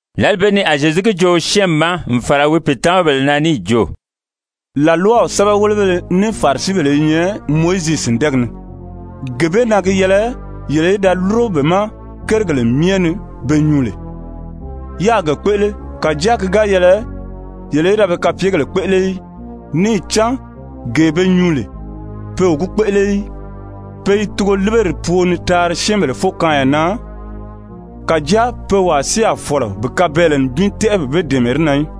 Lǎli bee ni a Zyezu gi joo syɛ́ɛnmi ma n fàra wi pìitamabèle na níì jo: «làlwaw sɛ́bɛwelebéleFarisibèle i nyɛ Mowizi sìndɛɛgi ni. Gee bee na gi yɛlɛ yele í da lúro be ma kérigèle myɛ ni be nyuu lè, yáā ge kpéʔele, kàjáa ki ga yɛlɛ yele í da be kapyegèle kpéʔele í. Níì cán gee be nyuu lè, pe o gi kpéʔele í. Pe i tugoliberi pwoo ni taari syɛ́ɛnbèle fókaanya na, kàjáa pe wàa si a fɔ̀lɔ bi kabɛɛlɛ nibin tɛ́ʔɛ bi be dɛ̀ɛmɛ di na í.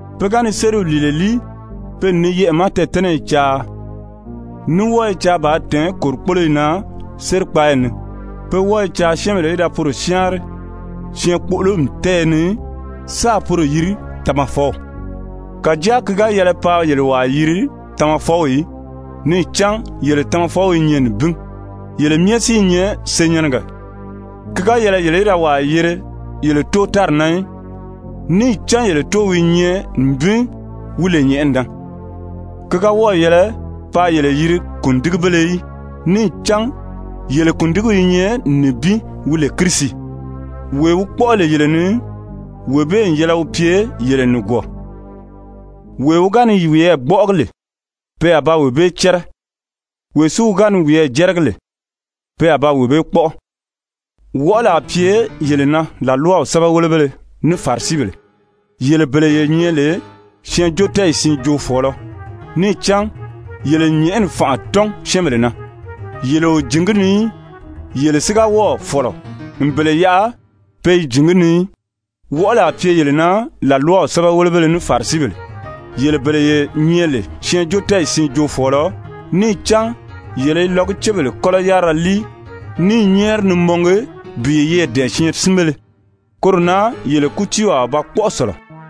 Pe ga ni sériw lìile líi, pe n ni yɛʔɛ̀ ma tɛɛ̀tɛ́nɛyi caa, ní wɔ́ɔ i caa bàā tɛ̀ɛ́n kòrikpoloyi na sérikpaayi ni. Pe wɔ́ɔ i caa syɛ́ɛnbèle í da poro syáanri syɛɛnkpoʔolomi tɛ́ɛyɛ ni sáà poro yiri, Tamafɔw. Kàjáa ki ga yɛlɛ paa yele wàa yiri Tamafɔw í. Níì cán yele Tamafɔw i nyɛ nibin, yele myɛ si i nyɛ senyɛnnɛgɛ. Ki ga yɛlɛ yele í da wàa yiri yele tóo tári na í, níì cán yele Tóow i nyɛ nibin, wi lè nyɛ̀ʔɛni na. Ki ga wɔ́ɔ̀ yɛlɛ paa yele yiri Kùndigibéle í, níì cán yele Kùndigiw i nyɛ nibin wi lè Kirisi. Wee wi kpɔ́ʔɔ lè yele ni, wee bee n yɛlɛ wi pye yele nìgwɔɔ. Wee wi ga ni wiyɛɛ gbɔ́ʔɔgi lè, pe a ba wee bee cɛ́rɛ, wee si wi ga ni wiyɛɛ jɛ́rɛgi lè, pe a ba wee bee kpɔ́ʔɔ. «Wɔʔɔli a pye yele na, làlwaw sɛ́bɛwelebéleFarisibèle, yele bele ye nyɛ lè syɛɛnjóotɛɛyi siin joofɔɔlɔ! Níì cán yele n nyɛ̀ʔɛni fànʔa tɔ́n syɛ́ɛnbèle na. Yele o jǐn gi ni í, yele si ga wɔ́ɔ̀ fɔ̀lɔ n bele yaʔa pe i jǐn gi ni í. [ Wɔʔɔli a pye yele na, làlwaw sɛ́bɛwelebéle ní Farisibèle, yele bele ye nyɛ lè syɛɛnjóotɛɛyi siin joofɔɔlɔ! Níì cán yele i lɔgucebèle kɔ́lɔ yárira líi ní i nyɛ́ɛri ni mɔngi bi yeyɛɛ dɛ̀ɛn syɛɛnsinbéle. Koro na yele kútiiw a ba kpɔ́ʔɔ sɔ̀lɔ.]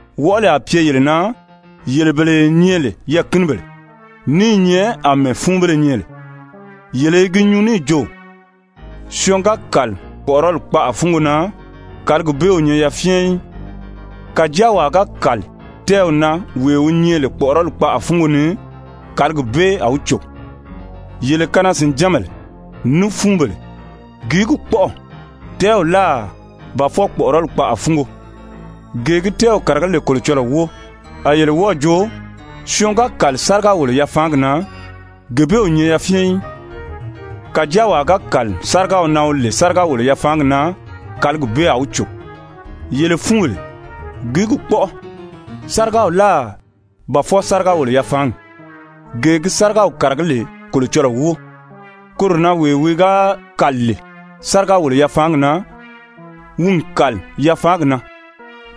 Wɔʔɔli a pye yele na, yele bele ye nyɛ lè yɛɛ̀kinibèle, ní i nyɛ àmɛɛ fúunbéle nyɛ lè! Yele i gi nyuu níì jo: ‹Syɔɔn ga kàli kpɔ̀ʔɔrɔli kpaʔa fúngo na, kàligi bee o nyɛ yafyɛn í. Kàjáa wàa ga kàli tɛ́ɛw na, wee wi nyɛ lè kpɔ̀ʔɔrɔli kpaʔa fúngo ni, kàligi bee a wi cò.› Yele kanaa-sìnjánbèle, ní fúunbèle! Gìí gi kpɔ́ʔɔ, tɛ́ɛw láà, ba fwɔɔ kpɔ̀ʔɔrɔli kpaʔa fúngo, gee gi tɛ́ɛw kàragí lè Kolocɔlɔɔ wóo? A yele wɔ́ɔ̀ jo: ‹Syɔɔn ga kàli sáriga-wòlo-yafaangi na, gee bee o nyɛ yafyɛn í. Kàjáa wàa ga kàli sárigaw na wi lè sáriga-wòlo-yafaangi na, kàligi bee a wi cò.› Yele fúunbèle, gìí gi kpɔ́ʔɔ, sárigaw láà, ba fwɔɔ sáriga-wòlo-yafaangi, gee gi sárigaw kàragí lè Kolocɔlɔɔ wóo? Koro na wee wi ga kàli lè sáriga-wòlo-yafaangi na, wi n kàli yafaangi na,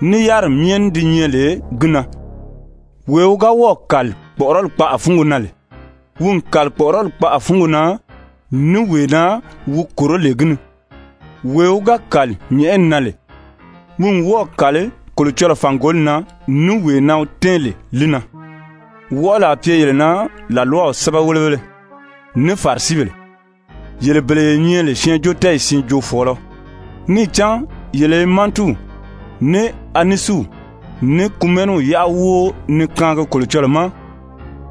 ní yáriri myɛ ní di nyɛ lè gi na. Wee wi ga wɔ́ɔ̀ kàli kpɔ̀ʔɔrɔli kpaʔa fúngo na lè, wi n kàli kpɔ̀ʔɔrɔli kpaʔa fúngo na, ní wee na wi kòró lè gi ni. Wee wi ga kàli nyɛ̀ʔɛni na lè, wi n wɔ́ɔ̀ kàli Kolocɔlɔɔ fàngoli na ní wee na wi tɛ́ɛn lè li na. Wɔʔɔli a pye yele na, làlwaw sɛ́bɛwelebéle, ní Farisibèle, yele bele ye nyɛ lè syɛɛnjóotɛɛyi siin joofɔɔlɔ! Níì cán yele i mantiw, ní anisiw, ní kumɛniw kumɛniw: Mantiw, ní anisiw, ní kumɛniw i nyɛ Zyefubèle cɛnʔɛ yárira. yáʔa wóo ni kaangi Kolocɔlɔɔ ma,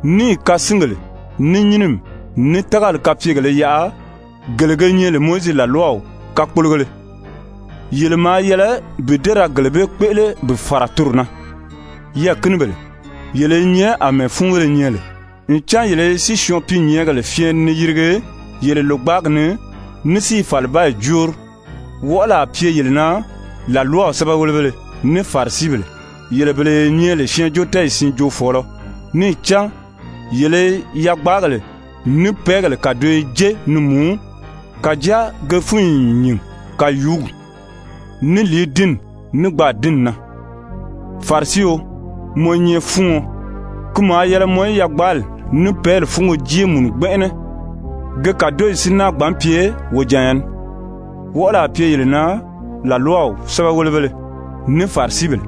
níì kasingèle, ní nyínimi, ní tágali kapyegèlē yaʔa gele ge nyɛ lè Mowizi làlwaw kakpologéle. Yele maa yɛlɛ bi dée ra gele bee kpéʔele bi fàra toro na. Yɛɛ̀kinibèle, yele i nyɛ àmɛɛ fúunbéle nyɛ lè, ncan yele i sísyɔɔn-piinyɛɛngèle fyɛɛni ni yirigi yele lògbaagi ni ní si i fàlibaayi jóori. Wɔʔɔli a pye yele na, làlwaw sɛ́bɛwelebéle, ní Farisibèle, yele bele ye nyɛ lè syɛɛnjóotɛɛyi siin joofɔɔlɔ! Níì cán yele i yagbaagèle ní pɛ́ɛgèle kàdoyo jé ni mùú, kàjáa ge fúnyi n nyìn kàyuugi, ní lìidinni, ní gbaadinni na. Farisio, mɔ i nyɛ fúuɔn. Ki maa yɛlɛ mɔ í yagbaali ní pɛ́ɛli fúnyo jée mùnu gbɛnʔɛnɛ, ge kàdoyi si náa gbǎn pye wojanya ní. Wɔʔɔli a pye yele na, làlwaw sɛ́bɛwelebéle, ní Farisibèle,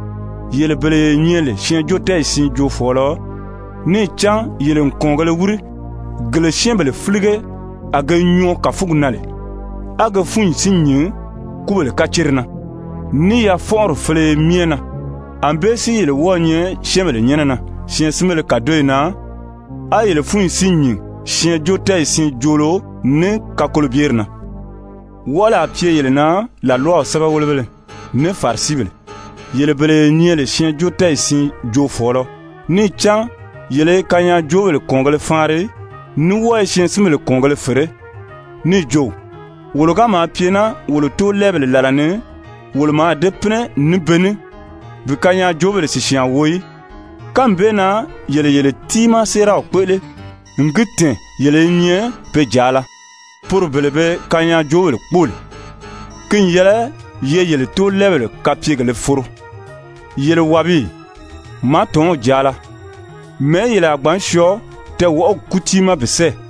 yele bele ye nyɛ lè syɛɛnjóotɛɛyi siin joofɔɔlɔ! Níì cán yele n kɔ̀ɔngēle wíri, gele syɛ́ɛnbèle fílige a ge nyɔɔ kàfugi na lè, á ge fúnyi si nyìn kúbèle kacere na, ní yafɔnʔɔri féleye myɛ na. Anbée si yele wɔ́ɔ̄ nyɛ syɛ́ɛnbèle nyɛ́nɛ na syɛɛnsinbéle kàdoyi na, á yele fúnyi si nyìn syɛɛnjóotɛɛyi siin joolo ní kakolobyeri na. Wɔʔɔli a pye yele na, làlwaw sɛ́bɛwelebéle, ní Farisibèle, yele bele ye nyɛ lè syɛɛnjóotɛɛyi siin joofɔɔlɔ! Níì cán yele i kanyaajoobèle kɔ̀ɔngēle faanri, ní wɔ́ɔ i syɛɛnsinbèle kɔ̀ɔngēle fèré. Níì jo: ‹Wolo ga maa pye naa wolo tóolɛɛbèle làla ni, wolo mǎà dée pínɛ ní be ní bi kanyaajoobèle sìsyaan wo í.› Kánmi bee na yele yele tiimaa séeraw kpéʔele, n gi tɛ̀ɛn yele i nyɛ pe jàala, poro bele be kanyaajoobèle kpóo lè. Ki n yɛlɛ ye yele tóolɛɛbèle kapyegèlē foro! Yele wàbiyi, màátɔnw jàala, mɛ̀ɛ́ yele a gbǎn syɔɔ tɛɛwɔʔɔgi kútii ma bi sɛ́ɛ?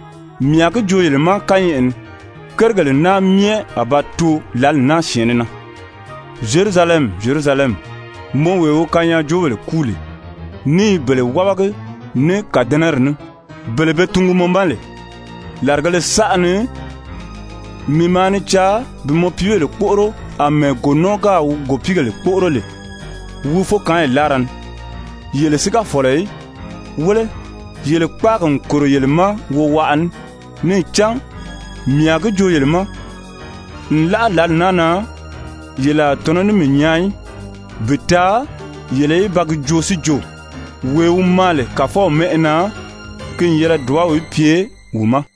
Mii a gi joo yele ma kányɛʔɛ ni, kérigèle naa myɛ a ba too lǎli naa syɛ̀ɛnnɛ na. «Zyerusalɛmi, Zyerusalɛmi, mɔ wee wi kanyaajoobèle kúu lè ní i bele wábagi ní kàdɛnɛri ní, bele be tungu mɔ ma lè, làrigēle saʔa ni mii maa ni caa bi mɔ piibèle kpóʔoro àmɛɛ gònɔɔ gáà wi gòpiigèle kpóʔoro lè wi fókaanyi láara ni, yele si ga fɔ̀lɔ í. Wéle, yele kpáagi n kòro yele ma wowaʔa ní. Níì cán mii a gi joo yele ma, nlaʔa lǎli naa na, yele a tɔ̀nɔ́ ní mii nyaa í, bi taa yele í ba gi joo si jo: ‹Wee wi maa lè Kàfɔw mɛ́ʔɛ na, ki n yɛlɛ dùbaw í pye wi ma.›»